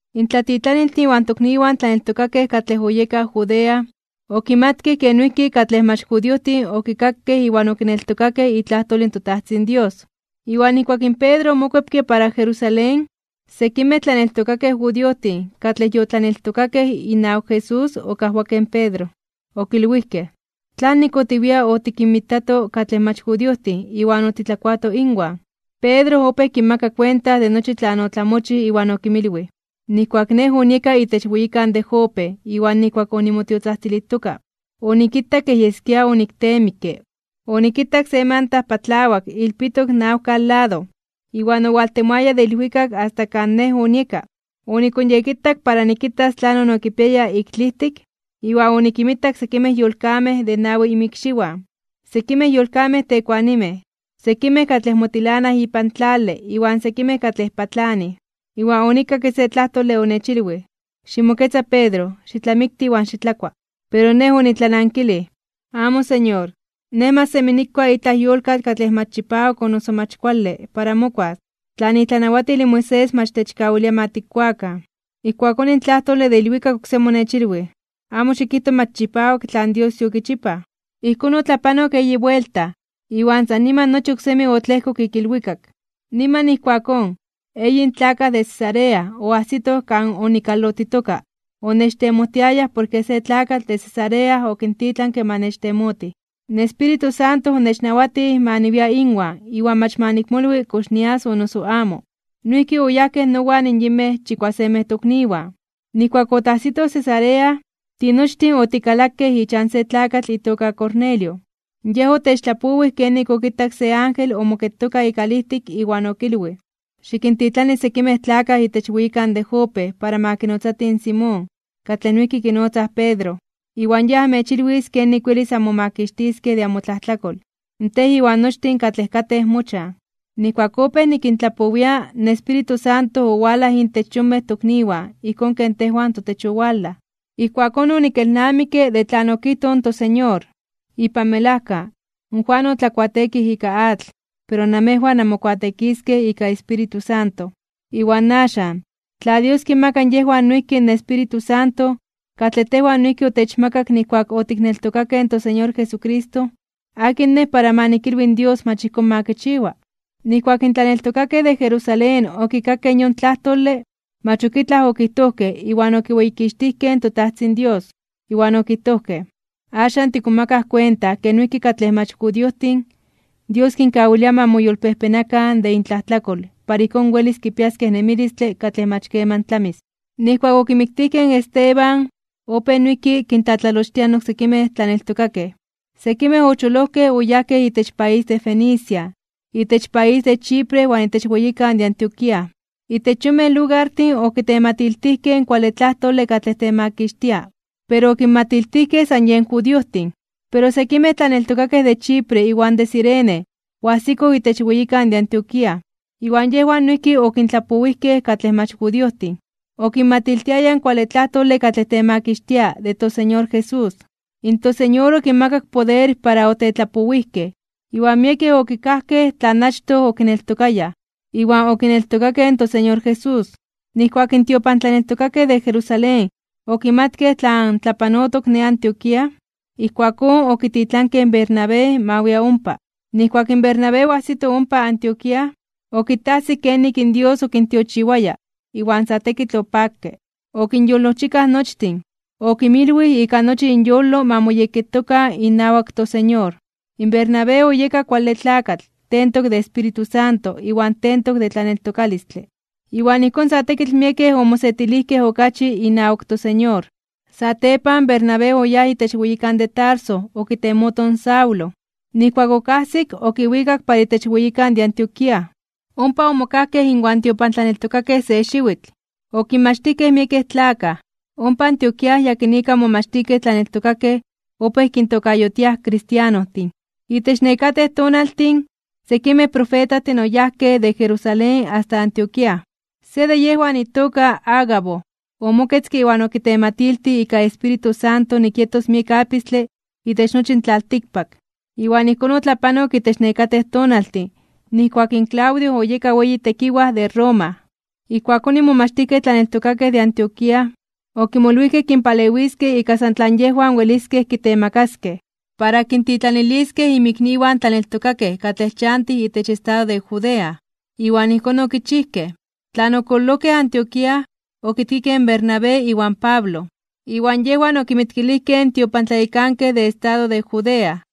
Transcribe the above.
In tlatitlaniltin iwan tokniwan tlaneltokakej katlej oyekaj Judea, okimatkej ke noijki katlej mach judiojtin okikakej iwan okineltokakej itlajtol in toTajtzin Dios. Iwan nijkuak in Pedro omokuepke para Jerusalén, sekimej tlaneltokakej judiojtin katlej yotlaneltokakej inawak Jesús okajwakej in Pedro. Okilwijkej: ―¿Tlanik otiwia otikinmitato katlej mach judiojtin iwan otitlakuatoj inwan? Pedro opéj kinmaka kuenta de nochi tlan otlamochij iwan okinmilwij: ―Nijkuak nej onieka itech weyikan de Jope, iwan nijkuak onimotiotzajtzilijtoka, onikitak kej yeskia onikteemikke, onikitak se manta patlawak ilpitok nawkan lado, iwan owaltemoaya de ilwikak asta kan nej onieka. Onikonyekitak para nikitas tlanon okipiaya ik tlijtik, iwan onikinmitak sekimej yolkamej de nawi inmikxiwan, sekimej yolkamej tekuanimej, sekimej katlej motilanaj ipan tlale iwan sekimej katlej patlanij. Iwan onikakke se tlajtole onechilwij: “Ximoketza Pedro, xitlamikti iwan xitlakua.” Pero nej onitlanankilij: “Amo, Señor. Nej mach semi nikua itlaj yolkatl katlej mach chipawak o noso mach kuale para mokuas, tlan itlanawatil in Moisés mach techkawilia ma tikkuakan.” Ijkuakón in tlajtole de ilwikak oksemi onechilwij: “Amo xikijto mach chipawak tlan Dios yokichipaj.” Ijkón otlapanok eyi buelta, iwan san niman nochi oksemi otlejkok ik ilwikak. Niman ijkuakón, eyin tlakaj de Cesarea oajsitoj kan onikalotitoka onechtemojtiayaj porke se tlakatl de Cesarea okintitlanke ma nechtemotij. In Espíritu Santo onechnawatij ma niwia inwan iwan mach ma nikmolwi kox nias o noso amo. Noijki oyajkej nowan yinmej chikuasemej tokniwan. Nijkuak otajsitoj Cesarea, tinochtin otikalakej ichan se tlakatl itoka Cornelio, yej otechtlapowij kenik okitak se ángel omoketoka ikalijtik iwan okilwij: “Xikintitlani sekimej tlakaj itech weyikan de Jope para ma kinotzatij in Simón, katlej noijki kinotzaj Pedro, iwan yej amechilwis kenik welis anmomakixtiskej de amotlajtlakol, tej iwan nochtin katlej katej mochan.” Nijkuak opéj nikintlapowia, in Espíritu Santo owalaj intech yonmej tokniwan ijkón ken tejwan totech owalaj. Ijkuakón onikelnamikke de tlan okijtoj in toSeñor: “Ipan melajka, in Juan otlakuateekij ika atl, pero namejwan anmokuateekiskej ika Espíritu Santo.” Iwan axan, tla Dios kinmaka yejwan noijki in Espíritu Santo, katlej tejwan noijki otechmakak nijkuak otikneltokakej in toSeñor Jesucristo, ¿akin nej para ma nikilwi in Dios mach ijkón ma kichiwa? Nijkuak in tlaneltokakej de Jerusalén okikakej in yon tlajtole, mach ok itlaj okijtojkej iwan okiweyikixtijkej in toTajtzin Dios, iwan okijtojkej: ―¡Axan tikmomakaj kuenta ke noijki katlej mach judiojtin, Dios kinkawilia ma moyolpejpenakan (ma moyolkuepakan) de intlajtlakol para ijkón welis kipiaskej nemilistle katlej mach keman tlamis! Nijkuak okimiktijkej in Esteban, opéj noijki kintlatlalochtiaj in oksekimej tlaneltokakej. Sekimej ocholojkej oyajkej itech país de Fenicia, itech país de Chipre iwan itech weyikan de Antioquía. Itech yonmej lugartin okitematiltijkej in kuale tlajtole katlej temakixtia, pero okinmatiltijkej san yen judiojtin. Pero sekimej tlaneltokakej de Chipre iwan de Cirene oajsikoj itech weyikan de Antioquía, iwan yejwan noijki okintlapowijkej katlej mach judiojtin, okinmatiltiayaj in kuale tlajtole katlej temakixtia de toSeñor Jesús. ToSeñor okinmakak poder para otetlapowijkej, iwan miekej okikajkej tlan achtoj okineltokayaj, iwan okineltokakej in toSeñor Jesús. Nijkuak in tiopantlaneltokakej de Jerusalén okimatkej tlan tlapanotok ne Antioquía, ijkuakón okititlankej in Bernabé ma wia ompa. Nijkuak in Bernabé oajsito ompa Antioquía, okitajsik kenik in Dios okintiochiwaya, iwan sa tekitl opakke. Okinyolojchikaj nochtin, okinmilwij ika nochi inyolo ma moyekketokan inawak toSeñor. Bernabé oyeka kuale tlakatl, tentok de Espíritu Santo iwan tentok de tlaneltokalistle. Iwan ijkón sa tekitl miekej omosetilijkej okachi inawak toSeñor. Satepan, Bernabé oyáj itech weyikan de Tarso okitemoto in Saulo. Nijkuak okajsik, okiwikak para itech weyikan de Antioquía. Ompa omokajkej inwan tiopantlaneltokakej se xiwitl. Okinmachtijkej miekej tlakaj. Ompa Antioquía yakinika in momachtijkej tlaneltokakej opéj kintokayotiaj kristianostin. Itech nekatej tonaltin, sekimej profetajtin oyajkej de Jerusalén asta Antioquía. Se de yejwan itoka Agabo, omoketzke iwan okitematiltij ika Espíritu Santo nik yetos miek apistle itech nochi in tlaltikpak. Iwan ijkón otlapanok itech nekatej tonaltin nijkuak in Claudio oyeka weyi tlanawatij de Roma. Ijkuakón in momachtijkej tlaneltokakej de Antioquía, okimolwijkej kinpalewiskej ika san tlan yejwan weliskej kitemakaskej, para kintitlaniliskej inmikniwan tlaneltokakej katlej chantij itech estado de Judea. Iwan ijkón okichijkej. Tlan okololojkej Antioquía, okitkikej in Bernabé iwan Pablo, iwan yejwan okinmitkilijkej in tiopantlayekankej de estado de Judea.